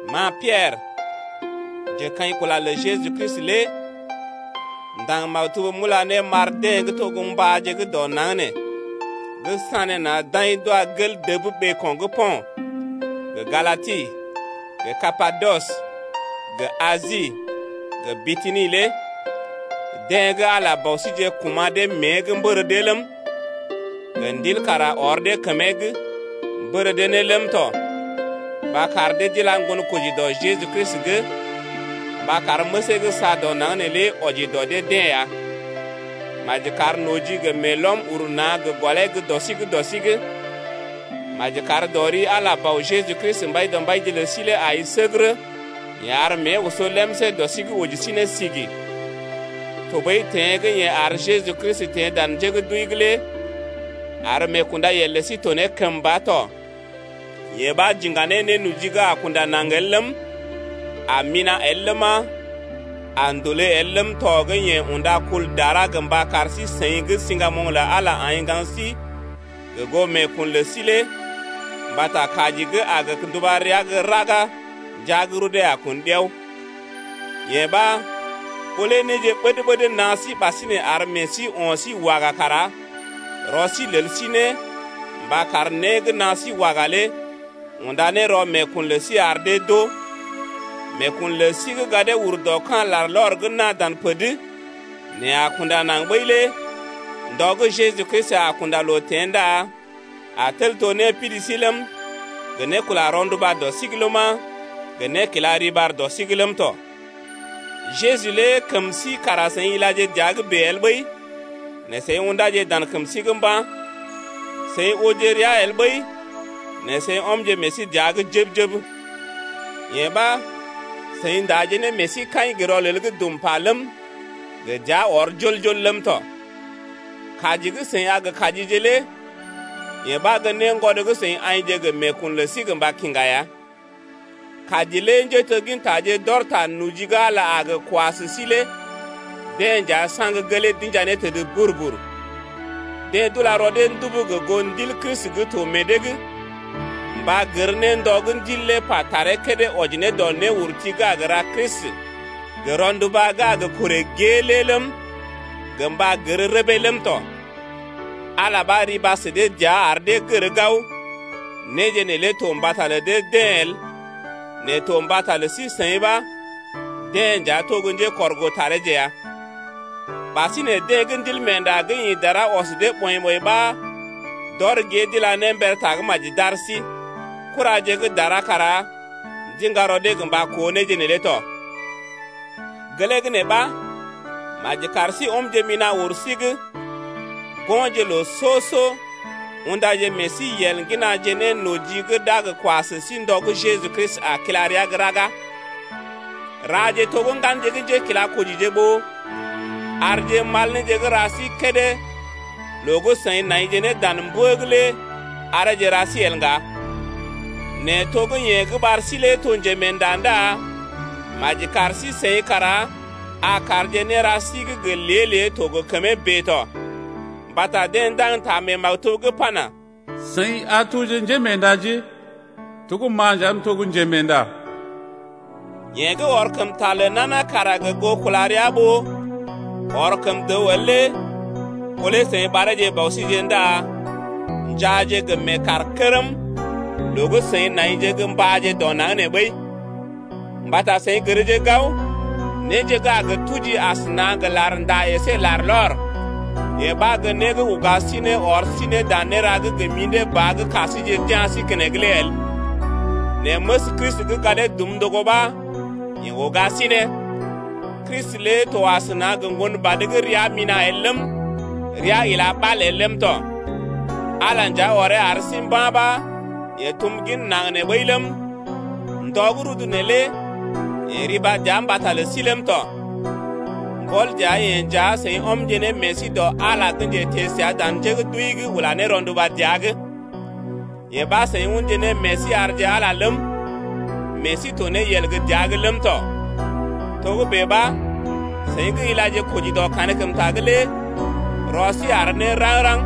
Ma Piɛrə, njekaḭkula lə Jeju Kristi lé m’ndaŋg maktub m’ula ne m’ar deḛ gə́ to gə́ mbáje gə́ dɔ naŋg nee gə́ sanéna̰ d’aḭ d’wa gel dəb ɓeeko̰ gə́ Po̰t, gə Galati, gə Kapadɔs, gə Asi, gə Bityni lé deḛ gə́ Ala Bɔ síje kuma̰ dee mée’g mbər dee ləm, gə Ndil kara ɔr dee kəmee’g, mbər dee ne ləm tɔ, mba kar dee d’ila ŋgonkoji dɔ Jeju Kristi’g mba kar məsee gə́ saa dɔ naŋg neelé wɔji dɔ dee-deḛ ya. Maji kar noji gə meelɔm uru na̰ gə gɔlee gə́ dɔ sí’g dɔ sí’g. Maji kar dɔ ri Ala Bɔ Jeju Kristi Mbaidɔmbaije lə sí lé ai səgərə. Yeḛ ar mée oso lemsé dɔ sí’g oji sí ne sigi, tɔɓəi teḛ gə́ yeḛ ar Jeju Kristi teḛ dan njé gə́ d’wəi’g lé ar meekundayel lə sí to ne kəmba tɔ. Yee ɓa j’iŋga ne nénoji gə́ a kunda naŋg el ləm, a mina̰ el ləma, a ndòlé el ləm tɔ gə́ yeḛ unda kul dara gə mba kar sí-seḭ gə́ siŋgamoŋ lə Ala aḭ ŋgaŋ sí gə goo meekun lə sí lé mbata kaji gə́ a gə nduba rəa gə́ raga ndəa gə́ rudee a kun ɗiao lé. Yee ɓa ɓó lé néje ɓəd-ɓəd naa sí ɓasinè ar meḛ sí o̰ sí waga kara rɔ sí lel sí ne mba kar né gə́ naa sí waga lé unda ne rɔ meekun lə sí ar dee d’oo. Meekun lə sí gə́ gadee ur dɔ ka̰ larlɔr gə́ naa dan pər’d nɛ a kunda naŋg ɓəi lé ndɔ gə́ Jeju Kristi a kunda loo teḛ ndá a tel to népidi sí ləm, gə né kula rɔnduba dɔ sí’g ləma, gə né kila riɓar dɔ sí’g ləm tɔ. Jeju lé kəm sí kara seḭ ilaje dəa’g bèe el ɓəi, nɛ seḭ ṵdáje dan kəm sí’g mba̰, seḭ ooje rəa el ɓəi nɛ seḭ ɔmje meḛ sí dəa’g jəb-jəb. Yee ɓa seḭ ndaje ne meḛ sí kaḭ gə rɔlel gə́ dum pa ləm, gə dəa ɔr jol-jol ləm tɔ. Kaji gə́ d’a kaji sí lé yee ɓa gə́ néngwɔd gə́ seḭ aḭje gə meekun lə sí gə mba kiŋgá ya. Kaji lé njéteggintaje gə́ d’ɔr ta noji gə́ Ala a gə kwa sə sí lé deḛ nja saŋg gelee d’inja ne təd bur-bur. Deḛ d’ula rɔ dee ndubu gə goo Ndil Kristi gə́ to meḛ dee’g mba gər ne ndɔ gə́ Ndil lé pa taree kédé wɔji ne dɔ néurti gə́ a gə ra Kristi gə rɔnduba gə́ a gə korè gée lé ləm, gə mba gər rəbee ləm tɔ. Ala ɓa riba sə dee dəa ar dee gər gao, néje neelé to mbata lə dee-deḛ el nɛ to mbata lə sí-seḭ ɓa deḛ nja to gə́ njékɔrgoo tareeje ya. Ɓasinè deḛ gə́ Ndilmeenda gə́ ḭ dara ɔs dee ɓɔḭ-ɓɔḭ ɓa d’ɔr gée d’ila ne mber Tagə́maji d’ar sí. Kuraje gə́ dara kara ndiŋga rɔ dee gə mba koo néje neelé tɔ. Gelee gə́ nee ɓa maji kar sí ɔmje mina̰ wur sí’g go̰je ne loo soo-soo undaje meḛ sí yel ŋginaje ne noji gə́ d’a gə kwa sə sí ndɔ gə́ Jeju Kristi a kila rəa gə́ raga. Raje to gə́ ŋganje gə́ njékilakojije ɓó arje mal néje gə́ ra sí kédé loo gə́ seḭ naije ne dan mbə’g lé areeje ra sí el ŋga. Nɛ to gə́ yeḛ gə́ ɓar sí lé to njemeenda ndá maji kar sí-seḭ kara a karje néra sí gə́ gə lée-lée to gə kəmee bèe tɔ, mbata deḛ ndaŋg ta mee maktub’g pana: Seḭ a toje gə kəmee doi mbata ma m’to gə kəmee doi ya. Yeḛ gə́ ɔr kəm ta lə nana kara gə goo kula rəa ɓó ɔr kəm dəw el lé ɓó lé seḭ ɓareeje Bɔ síje ndá njaaje gə meekaarkərm loo gə́ seḭ naije gə mbáje dɔ naŋg nee ɓəi. Mbata seḭ gərje gao, néje gə́ a gə tuji asəna gə larnda əsé larlɔr, yee ɓa gə́ né gə́ uga sí ne ɔr sí ne dan néra gə́ gə mḭdé ba gə́ ka síje d’ya̰ sí keneŋ lé el. Nɛ məs Kristi gə́ gadee dum ndogo ɓa yeḛ uga sí ne. Kristi lé to asəna gə ŋgon badə gə́ rəa mina̰ el ləm, rəa ila ɓal el ləm tɔ, Ala nja ɔree ar sí mba̰ ɓa yeḛ tum gin naŋg nee ɓəi ləm, ndɔ gə́ rudu neelé yeḛ riba dəa mbata lə sí ləm tɔ. Mbɔl dəa-yeḛ nja seḭ ɔmje ne meḛ sí dɔ Ala gə́ njeteḛ səa dan njé gə́ d’wəi’g ula ne rɔnduba dəa’g. Yee ɓa seḭ unje ne meḛ sí arje Ala ləm, meḛ sí to ne yel gə́ dəa’g ləm tɔ. Togə́bè ɓa, seḭ gə́ ilaje koji dɔ kankəmta’g lé rɔ sí àr ne raŋg-raŋg,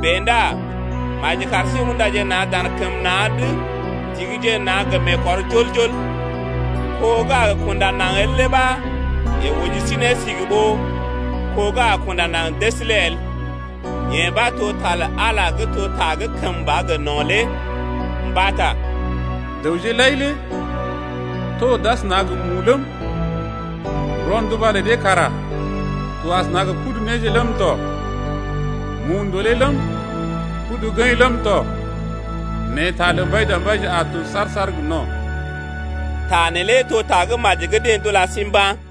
bèe ndá maji kar sí undaje na̰ dan kəm na̰’d ndigije na̰ gə meekɔr jol-jol. Ko gə́ a kunda naŋg el lé ɓa yeḛ oji sí ne sigi ɓó kó gə́ a kunda naŋg dəs lé el. Yee ɓa to ta lə Ala gə́ to ta gə́ kəmba gə no̰ lé. Mbata Dəwje lai lé to d’asəna gə mu ləm, Rɔnduba lə dee kara to asəna gə pudu néje ləm tɔ, Mu ndòlé ləm, pudu gəḭ ləm tɔ, Nɛ ta lə Mbaidɔmbaije a to saar-saar gə no̰. Ta neelé to Tagə́maji gə́ deḛ d’ula sí mba̰ ya.